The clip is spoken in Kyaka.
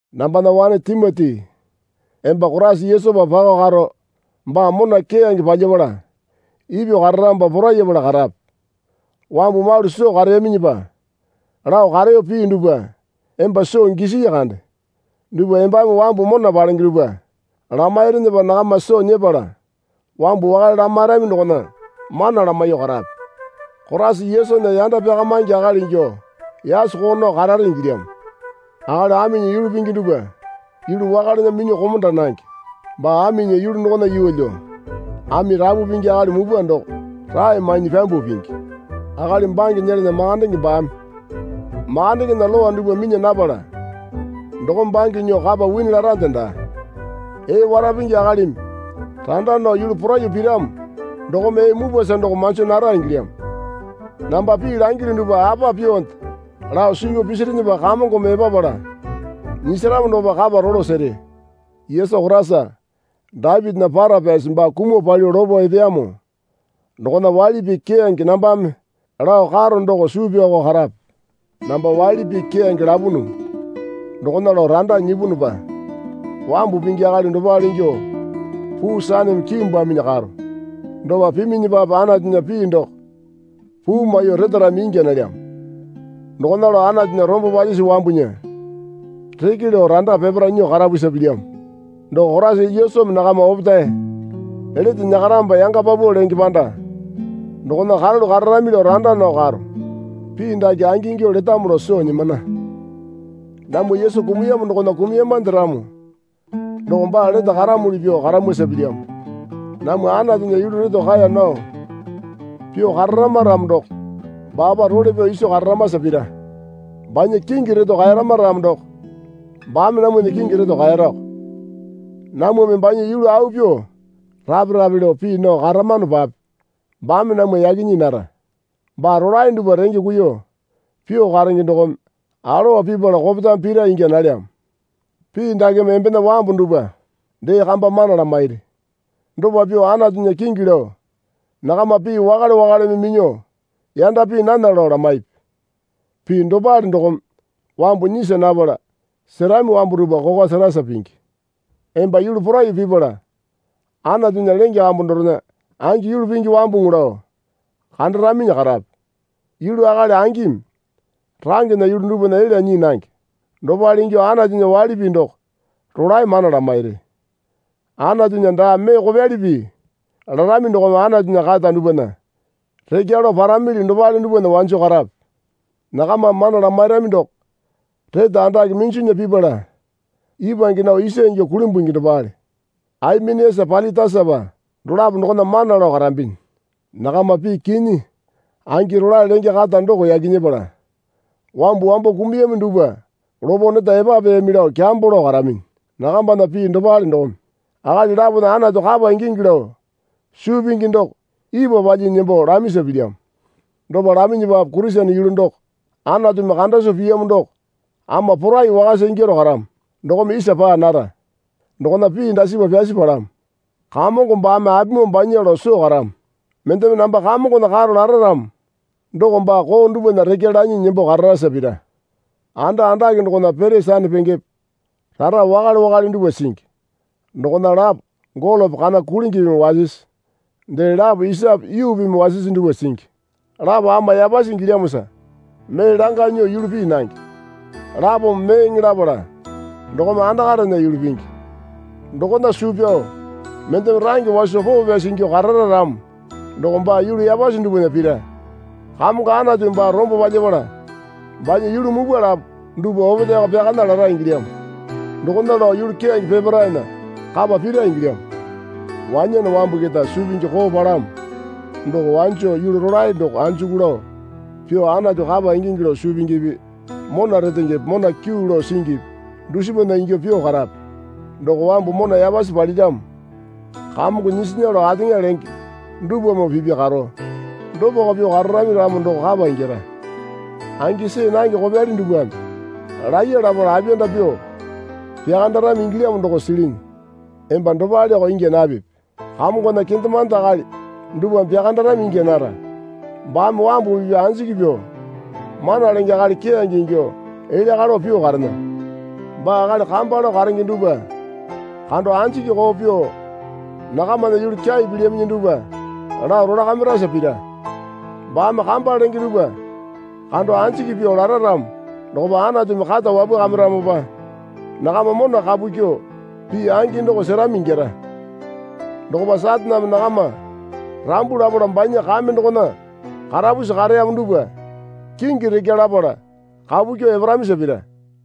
Nambana wane Timoti emba Koraisa Yesupa pakao karo baa mona keyange palyapala ipyuo kararamopa porayapala karape. Wambu malu soo kareyaminyipa lao kareyo pii dupwa emba soo gisii kande dupwa embame wambu mona palenge dupwa lamairinyipa nakama soo nyepala wambu wakale lamairami dokona mana lamaiyuo karape. Koraisa Yesunya yanda pyakamaingi akali ingyuo yasoko nao karare ingilyamo. Akali aminya yulu pingi dupwa yulu wakalena minyuo komonda nange. Baa aminya yulu dokona yeelyo ami rapu pingi akali mupwa doko rae mainyi pyambuo pingi. Akali bange nyelana makandenge baame makandengena lowa dupwa minya napala dokome bange nyuo kapa wini larande daa. Ee wara pingi akalimi randa nao yulu poraiyuo piramo dokome ee mupwasa doko manjo nara ingilyamo. Namba pii langilyu dupwa apa pyuonde lao suu pyao pisirinyipa Kamongome epapala nyisaramo dokopa kapa rolo sere. Yesu Koraisa Dapitinya para pyasi baa kumuo palyuo lopo epeyamo dokona waili pii keyange nambame lao karo doko suu pyaoko karape. Namba waili pii keyange lapunu dokona lao randa nyipunupa wambu pingi akali dopale ingyuo puu saneme kiimbwaminyi karo. Dopa piminyipape Anatunya pii doko puu maiyuo retarami ingya nalyamo. Dokona lao Anatunya rombo palyisi wambunya reke lao randa peparae nyuo karapusa pilyamo. Doko Koraisa Yesumi nakama opetae lete nyakaramopa yanga paupau lenge panda dokona karalu kararami lao randa nao karo. Pii dake angingyuo letamo lao soo nyimana. Namwa Yesu kumuyamo dokona kumuyamande ramo doko baa lete karamuli pyuo karamwasa pilyamo. Namwa Anatunya yulu reto kaeya nao pyuo kararama ramo doko baapa role pyao iso kararamasa pira. Banya kingi reto kaeyarama ramo doko baame namwana kingi reto kaeyarako. Namwame banya yulu au pyuo rape rape lao pii nao karamanopape baame namwa yaki nyii nara. Baa rolae dupwa renge kuiyuo pyuo karenge dokome alowa pipala kopetame pira ingya nalyamo. Pii dakeme embena wambu dupwa dee kamba mana lamairi. Dopa pyuo Anatunya kingi lao nakama pii wakale wakaleme minyuo yanda pii nana lao lamaipi. Pii dopale dokome wambu nyisa napala, serami wambu dupwa kokwa serasa pingi. Emba yulu poraiyuo pipala Anatunya lenge kambu dorena angi yulu pingi wambuŋu lao kandaraminyi karape. Yulu akali angimi rangena yulu dupwana elya nyii nange. Dopale ingyuo Anatunya waili pii doko rolae mana lamairi. Anatunya daa mee kopyali pii larami dokome Anatunya kata dupwana rekya lao paramili dopale dupwana wanjo karape. Nakamame mana lamairami doko rete andake minjunya pipala ipwange nao isa ingyuo kulimbungi dopale. Aimeniasa Pailitasapa dolapo dokona mana lao karambinyi. Nakama pii kinyi angi rolae lenge kata doko yaki nyepala wambu wambo kumuyami dupwa lopo neta epapeyami lao kyambo lao karaminyi. Nakambana pii dopale dokome akali lapona Anatu kapa ingingi lao suu pingi doko ipwa palyinyi nembo lamisa pilyamo. Dopa laminyipape Kurisene yulu doko Anatumi kanda soo piyamo doko ama porai wakasa ingyaro karamo dokome isa paa nara. Dokona pii dasipa pyasi palamo. Kamongo baame apimoo banya lao soo karamo. Mendeme, Namba Kamongona karo lara ramo doko baa koo dupwana rekya lanyi nembo kararasa pira. Anda andake dokona pete sanapengepe rara wakale wakale dupwa singi. Dokona lapo golope kana kulingipimi wasisi dee lapo isape yuupimi wasisi dupwa singi. Lapo ama yapasi ingilyamosa mee langa nyuo yulu pii nange. Lapome meeŋe lapala dokome andakarena yulu pingi. Dokona suu pyao mendeme range waso poo pyasi ingyuo karara ramo doko baa yulu yapasi dupwana pira. Kamongo Anatumi baa rombo palyapala banya yulu mupwa lapo dupwa opetaeko pyakana lara ingilyamo. Dokona lao yulu keyange peparaena kapa pira ingilyamo. Wanyane wambu keta suu pingi koo palamo doko wanjo yulu rolae doko anjuku lao pyuo Anatu kapa ingingi lao suu pingipi mona retengepe mona kyuu lao singipi dusipana ingyuo pyuo karape. Doko wambu mona yapasi paliramo Kamongo nyisinya lao ateŋa lenge dupwamoo pipya karo. Dopako pyuo kararami ramo doko kapa ingyara. Angi see nange kopyali dupwame laiya lapala apiyanda pyuo pyakandarami ingilyamo doko silinyi. Emba dopaleko ingya napipi. Kamongona kendemande akali dupwame pyakandarami ingya nara. Baame wambu pipya anjiki pyuo mana lenge akali keyange ingyuo elya kalo pyuo karena. Baa akali kamba lao karenge dupwa kando anjiki koo pyuo nakamana yulu kyai pilyaminyi dupwa lao rolakamirasa pira. Baame kamba lenge dupwa kando anjiki pyuo lara ramo dokopa Anatumi kata wapwakamiramopa nakama mona kapu kyuo pii angi doko serami ingyara. Dokopa Sataneme nakama rambu lapala banya kame dokona karapusi kareyamo dupwa kingi rekya lapala kapu kyuo eparamisa pira.